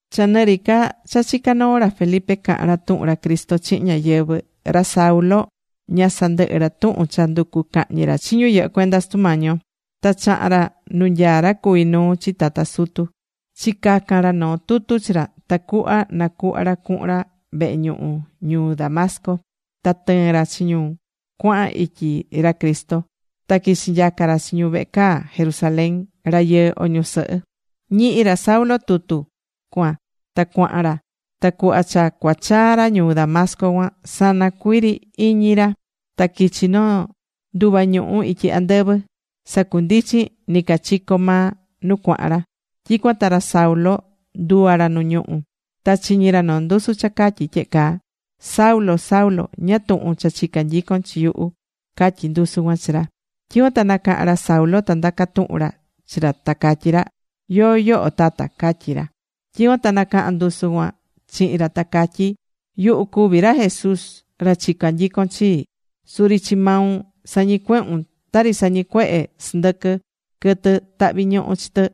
Cha nɨ ri ca cha chicá noo ra Felipe cahán ra tuhun ra Cristo chihin ñáyɨvɨ, ra Saulo ña sandɨhɨ́ ra tuhun cha nducú cahñi ra chi ñu yɨhɨ́ cuenda Sutu Mañi yo. Ta chaha̱n ra nu nyaá ra cuví nuu chi tata sutu, chicaca̱n ra noo tutu chi ra, tacuhva nacuhva ra cuhun ra vehe ñuhu ñuu Damasco, ta tɨɨn ra chi ñu cuahan ityi ra Cristo, ta quichi nyaca ra chi ñu vehe caa Jerusalén, rayɨɨ o ñusɨhɨ. Ñihi̱ ra Saulo tutu cuan ta cuaha̱n ra. Ta cuhva cha cuachaa ra ñuu Damasco cuan, sana cuii ri iñi ra, ta quichi̱ noo nduva ñuhu̱ ityi andɨvɨ, sacundichin nɨcachico maa nu cuaha̱n ra. Tyicuan ta ra Saulo nduva̱ ra nu ñuhú. Ta chiñi̱ ra noo ndusu cha catyí tyehe caa: ―Saulo, Saulo, ¿ñáá tuhun cha chicá nyicon chi yuhu? ―catyí ndusu cuan chi ra. Tyicuan ta nacaha̱n ra Saulo ta ndaca tuhu̱n ra chi ra ta catyí ra: ―¿Yóó yoho Tata? ―catyi ra. Tyicuan ta nacaha̱n ndusu cuan chihin ra, ta catyí: ―Yuhu cuví ra Jesús, ra chicá nyicon chi. Suri chi maun sañicuehún, tari sañicuehé sɨndɨquɨ quɨtɨ tahví ñuhu chi tɨ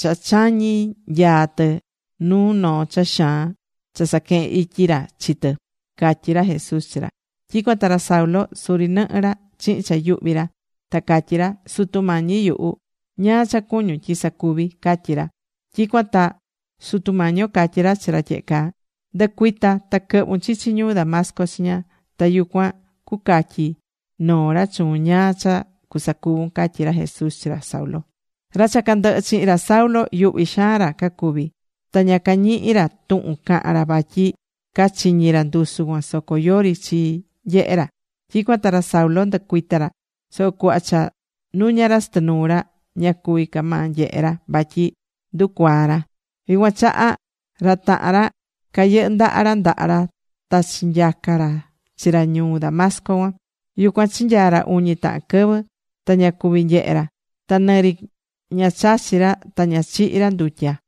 cha chañí nyaa tɨ nu noo cha xaan cha saquehen ityi ra chi tɨ ―catyí ra Jesús chi ra. Tyicuan ta ra Saulo suri nɨhɨ ra chihin cha yuhvi ra. Ta catyí ra: ―Sutu Mañi yuhu, ¿ñáá cha cuñún tyi sacuvi? ―catyí ra. Tyicuan ta Sutu Mañi yo catyí ra chi ra tyehe caa: ―Ndɨ̱cuita ta quɨ̱hvun chichi ñuu Damasco chiña. Ta yucuan cucatyi noo ra chuun ñáá cha cusacuvun ―catyí ra Jesús chi ra Saulo. Ra cha candɨhɨ chihin ra Saulo, yuhvi xaan ra cacuvi̱. Ta ña cañihi̱ ra tuhun cahan ra vatyi cachiñi̱ ra ndusu cuan soco yori chi nyehe ra. Tyicuan ta ra Saulo ndɨcuita̱ ra. Soco cuhva cha nuña̱ ra chɨtɨ nuu ra, ña cuví ca maa nyehe ra vatyi nducuaa̱ ra. Yucuan chaha, ra tahan ra cayɨndaha̱ ra ndaha ra ta chinyaca ra chi ra ñuu Damasco cuan. Yucuan chinyaa̱ ra uñi tahan quɨvɨ. Ta ña cuvi̱ nyehe ra. Ta nɨri ña chachi̱ ra, ta ña chihi̱ ra ndutya.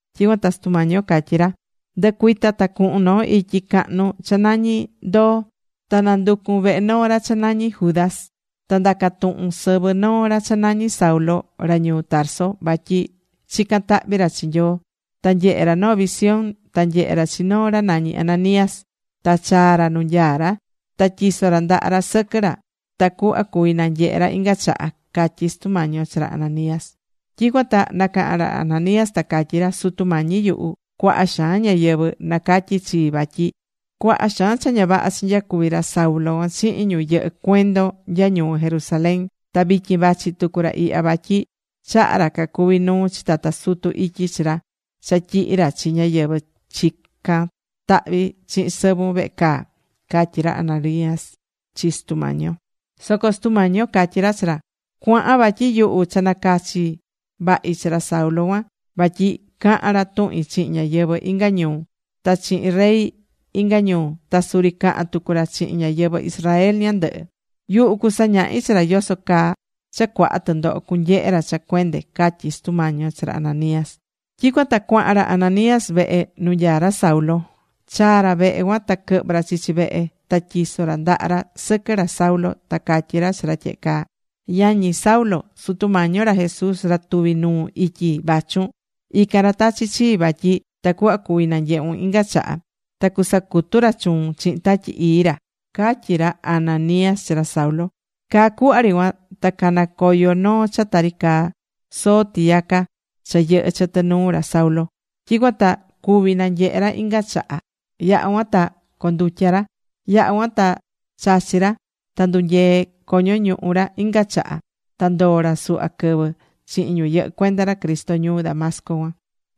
Tyicuan ta Sutu Mañi yo catyí ra: ―Ndɨ̱cuita, ta cu̱hun noo ityi cahnu cha nañi Ndoo. Ta na̱nducun vehe noo ra cha nañí Judas. Ta nda̱ca tuhun sɨvɨ noo ra cha nañí Saulo, ra ñuu Tarso. Vatyi chicán tahvi ra chi Nyoo. Ta nyehé ra noo visión, ta nyehé ra chi noo ra nañí Ananías. Ta chaá ra nu nyaá ra, ta tyisó ra ndaha ra sɨquɨ ra tacuhva cuví nanyehe ra inga chaha ―catyí Sutu Mañi yo chi ra Ananías. Tyicuan ta nacaha̱n ra Ananías ta catyí ra: ―Sutu Mañi yuhu, cuaha xaan ñáyɨvɨ nacatyí chii vatyi cuaha xaan cha ña vaha chinyacuvi̱ ra Saulo cuan chihin ñu yɨhɨ cuendon nya ñuu Jerusalén. Ta vityin vachi tucu ra ihya vatyi chaha̱ ra cacuví nuu chi tata sutu ityi chi ra cha tyihi ra chi ñáyɨvɨ chicán tahvi chihin sɨvun vehe caa ―catyi ra Ananías chi Sutu Mañi yo. Soco Sutu Mañi yo catyí ra chi ra: ―Cua̱han vatyi yuhu cha nacachi̱ vahi chi ra Saulo cuan, vatyi cahan ra tuhin chihin ñáyɨvɨ inga ñuu, ta chihin rey inga ñuu, ta suri cahan tucu ra chihin ñáyɨvɨ Israel ñandɨhɨ. Yuhu cusañahi chi ra yoso caa cha cuaha tɨndoho cunyehe ra cha cuende ―catyí Sutu Mañi yo chi ra Ananías. Tyicuan ta cuahan ra Ananías vehe nu nyaá ra Saulo. Chaa̱ ra vehe cuan ta quɨhvɨ̱ ra chichi vehe. Ta tyiso̱ ra ndaha ra sɨquɨ ra Saulo, ta catyí ra chi ra tyehe caa: ―Yañi Saulo, Sutu Mañi yo ra Jesús ra tuvi̱ nuun ityi vachun, ican ra tachi̱ chii vatyi tacuhva cuvi nanyehun inga chaha. Ta cusacutu ra chuun chihin Tatyi Ii ra ―catyí ra Ananías chi ra Saulo. Caa cuhva ri cuan ta cana̱ coyo noo cha tari caa soo tiyaca cha yɨhɨ̱ chɨtɨ nuu ra Saulo. Tyicuan ta cuvi̱ nanyehe ra inga chaha. Yaha̱ cuan ta condutya̱ ra. Yaha̱ cuan ta chachi̱ ra. Ta ndunyee̱ coño ñuhu ra inga chaha. Ta ndoo̱ ra suhva quɨvɨ chihin ñu yɨhɨ́ cuenda ra Cristo ñuu Damasco cuan.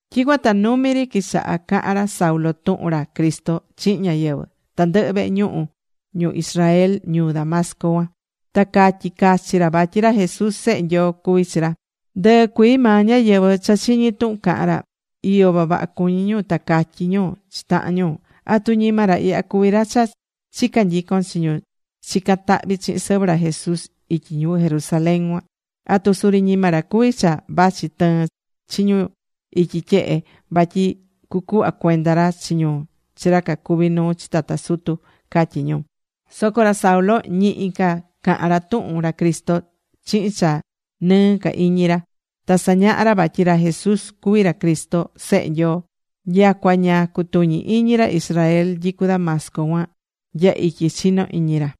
Tyicuan ta numi ri quichaha̱ cahan ra Saulo tuhun ra Cristo chihin ñáyɨvɨ tandɨhɨ vehe ñuhu ñu Israel ñuu Damasco cuan. Ta catyí cachi ra vatyi ra Jesús, Sehe Nyoo cuví chi ra. Ndɨɨ cuii maa ñáyɨvɨ cha chiñi̱ tuhun cahán ra, iyo vavaha cuñí ñu. Ta catyí ñu chi tahan ñu: ―¿Atu ñima ra ihya cuví ra cha chica nyicon chi ñu chicán tahvi chihin sɨvɨ ra Jesús ityi ñuu Jerusalén cuan? ¿Atu suri ñima ra cuví cha vachi tɨɨn chi ñu ityi tyehe vatyi cucuhva cuenda ra chi ñu chi ra cacuví nuu chi tata sutu? ―catyí ñu. Soco ra Saulo ñihi ca cahán ra tuhun ra Cristo chihin cha nɨɨ ca iñi ra. Ta sañahá ra vatyi ra Jesús cuví ra Cristo, Sehe Nyoo. Nyacua ña cutuñí iñi ra Israel nyicú Damasco cuan nya ityi chino iñi ra.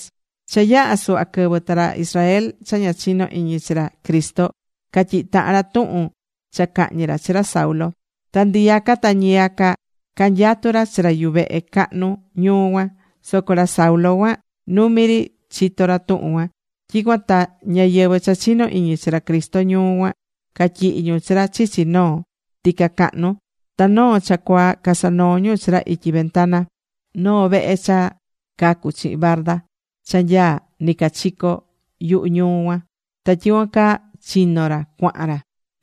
Cha yaha̱ suhva quɨvɨ, ta ra Israel cha ña chinó iñi chi ra Cristo catyihi̱ tahan ra tuhun cha cahñi ra chi ra Saulo. Ta ndiyaca ta ñiyaca canyatú ra chi ra yuvehe cahnu ñuu cuan. Soco ra Saulo cuan numi ri chito ra tuhun cuan. Tyicuan ta ñáyɨvɨ cha chinó iñi chi ra Cristo ñuu cuan catyihi̱ ñu chi ra chichi noo tica cahnu. Ta noo cha cuaa casanoo̱ ñu chi ra ityi ventana noo vehe cha cacu̱ chihin barda cha nyaá nɨcachico yuhu ñuu cuan. Ta tyicuan caa chino̱ ra cuahan ra.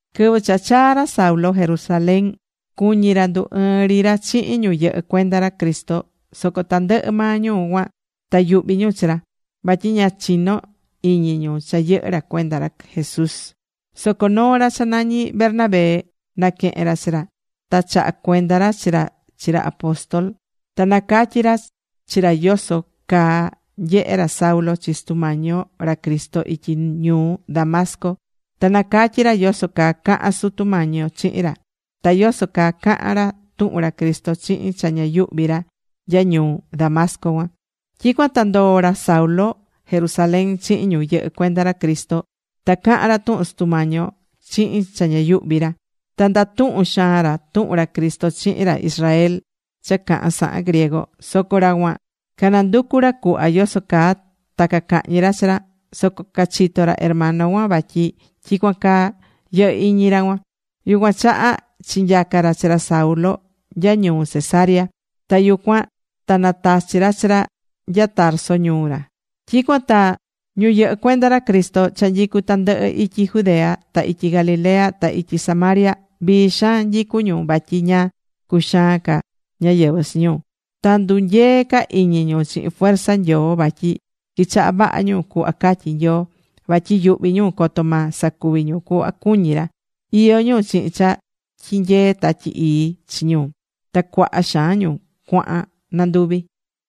Quɨvɨ cha chaa̱ ra Saulo Jerusalén, cuñi̱ ra ndu ɨɨn ri ra chihin ñu yɨhɨ́ cuenda ra Cristo. Soco tandɨhɨ maa ñu cuan ta yuhvi̱ ñu chi ra. Vatyi ña chinó iñi ñu cha yɨhɨ́ ra cuenda ra Jesús. Soco noo ra cha nañí Bernabé, naquehe̱n ra chi ra. Ta chaha̱ cuenda ra chi ra chi ra apóstol. Ta nacatyi̱ ra chi ra yoso caa nyehe̱ ra Saulo chi Sutu Mañi yo ra Cristo ityi ñuu Damasco; ta nacatyi̱ ra yoso caa caha̱n Sutu Mañi yo chihin ra. Ta yoso caa caha̱n ra tuhun ra Cristo chihin cha ña yuhvi ra nya ñuu Damasco cuan. Tyicuan ta ndoo̱ ra Saulo Jerusalén chihin ñu yɨhɨ́ cuenda ra Cristo. Ta cahan ra tuhun Sutu Mañi yo chihin cha ña yuhvi ra. Ta ndatuhún xaan ra tuhun ra Cristo chihin ra Israel cha cahan sahan griego. Soco ra cuan cananducu̱ ra cuhva yoso caa ta cacahñi ra chi ra. Soco cachitó ra hermano cuan vatyi tyicuan caa yɨhɨ́ iñi ra cuan. Yucuan chaha chinyaca ra chi ra Saulo nya ñuu Cesarea. Ta yucuan ta natachi̱ ra chi ra nya Tarso ñuu ra. Tyicuan ta ñu yɨhɨ́ cuenda ra Cristo cha nyicú tandɨhɨ ityi Judea, ta ityi Galilea, ta ityi Samaria, vii xaan nyicu ñu vatyi ña cuxaan ca ñáyɨvɨ chi ñu. Ta ndunyee̱ ca iñi ñu chihin fuerza Nyoo vatyi quichaha̱ vaha ñu cuhva catyí Nyoo, vatyi yuhví ñu coto ma sacuvi ñu cuhva cuñí ra. Iyó ñu chihin cha tyinyeé Tatyi Ii chi ñu. Ta cuaha xaan ñu cuahan nanduvi.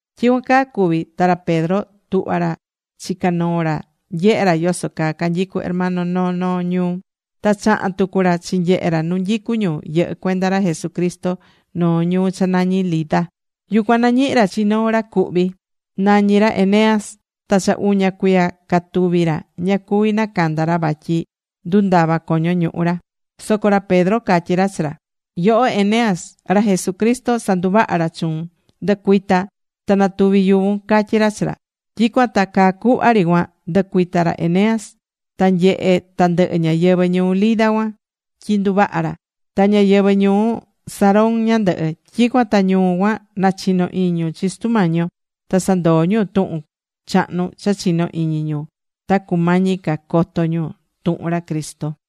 Tyicuan caa cuvi̱ ta ra Pedro tuhvá ra chica noo ra nyehe ra yoso caa canyicu hermano noo noo ñuu. Ta chahan tucu ra chinyehe ra nu nyicu ñu yɨhɨ́ cuenda ra Jesucristo noo ñuu cha nañí Lida. Yucuan nañihi̱ ra chi noo ra cuhvi. Nañi ra Eneas. Ta cha uña cuiya catuví ra ña cuvi nacanda ra vatyi ndundava coño ñuhu ra. Soco ra Pedro catyí ra chi ra: ―Yoho Eneas, ra Jesucristo sanduvaha̱ ra chuun. Ndɨ̱cuita ta na̱tuvi yuvun ―catyí ra chi ra. Tyicuan ta caa cuhva ri cuan ndɨcuita̱ ra Eneas. Ta nyehe̱ tandɨhɨ ñáyɨvɨ ñuu Lida cuan tyi nduvaha̱ ra. Ta ñáyɨvɨ ñuu Sarón ñandɨhɨ. Tyicuan ta ñu cuan nachino̱ iñi ñu chi Sutu Mañi yo. Ta sandoo̱ ñu tuhun chahnu cha chino̱ iñi ñu ta cumañi ca coto ñu tuhun ra Cristo.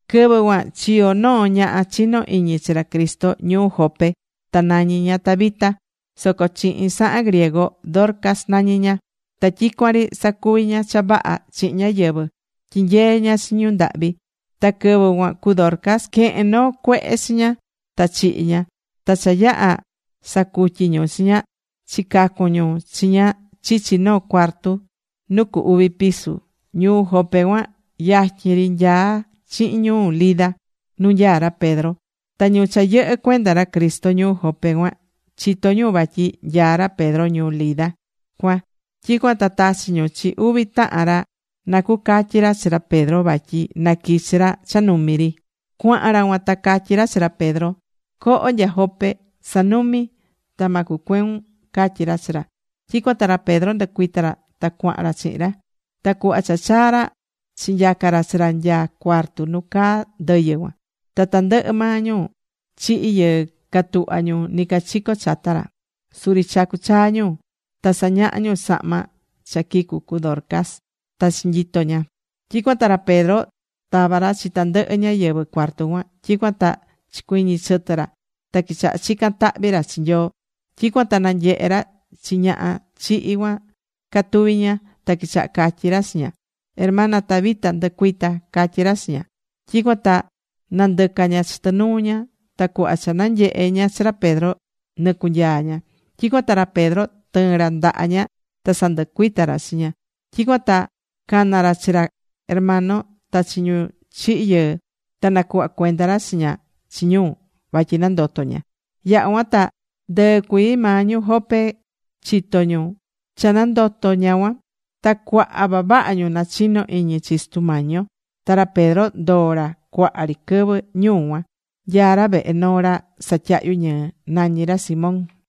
Quɨvɨ cuan chiyo̱ noo ñaha chinó iñi chi ra Cristo ñuu Jope. Ta nañí ña Tabita, soco chihin sahan griego, Dorcas nañí ña. Ta tyicuan ri sacuví ña cha vaha chihin ñáyɨvɨ. Tyinyeé ña chi ñu ndahvi. Ta quɨvɨ cuan cu Dorcas quehe̱n noo cuehe chi ña ta chihi̱ ña. Ta cha yaha̱ sacutyi̱ ñu chi ña, chicacun ñu chi ña chichi noo cuarto nu cu uvi piso. Ñuu Jope cuan yatyin ri nyaá chihin ñuu Lida, nu nyaá ra Pedro. Ta ñu cha yɨhɨ́ cuenda ra Cristo ñuu Jope cuan chitó ñu vatyi nyaá ra Pedro ñuu Lida cuan. Tyicuan ta tachi̱ ñu chi uvi tahan ra na cucatyi ra chi ra Pedro vatyi naquichi ra cha numi ri. Cuahan ra cuan ta catyí ra chi ra Pedro: ―Co̱ho nya Jope. Sa̱numi ta ma cucueun ―catyí ra chi ra. Tyicuan ta ra Pedro ndɨcuita̱ ra ta cuahan ra chihin ra. Ta cuhva cha chaa ra, chinyaca ra chi ra nya cuarto nu caa ndɨyɨ cuan. Ta tandɨhɨ maa ñu chihi̱ yɨɨ catuhva ñu nɨcachico chata ra. Suri chacú chaa ñu. Ta sañahá ñu sahma cha quicu̱ cu Dorcas ta chinyito ña. Tyicuan ta ra Pedro tava̱ ra chi tandɨhɨ ñáyɨvɨ cuarto cuan. Tyicuan ta chicuiñi chɨtɨ ra ta quichaha chican tahvi ra chi Nyoo. Tyicuan ta nanyehe̱ ra chi ñaha chihi̱ cuan catuvi ña. Ta quichaha̱ catyi ra chi ña: ―Hermana Tabita, ndɨ̱cuita ―catyí ra chi ña. Tyicuan ta nandɨca̱ ña chɨtɨ nuu ña. Ta cuhva cha nanyehe ña chi ra Pedro, nɨcunyaa̱ ña. Tyicuan ta ra Pedro tɨɨ̱n ra ndaha ña ta sandɨcuita̱ ra chi ña. Tyicuan ta cana̱ ra chi ra hermano, ta chi ñu chihi̱ yɨɨ. Ta nacuhva̱ cuenda ra chi ña chi ñu vatyi nandoto̱ ña. Yaha̱ cuan ta ndɨɨ cuii maa ñu Jope chitó ñu cha nandoto̱ ña cuan. Ta cuaha vavaha ñu nachino̱ iñi chi Sutu Mañi yo. Ta ra Pedro ndoo̱ ra cuaha ri quɨvɨ ñuu cuan. Nyaá ra vehe noo ra satyahyu ñɨɨ. Nañí ra Simón.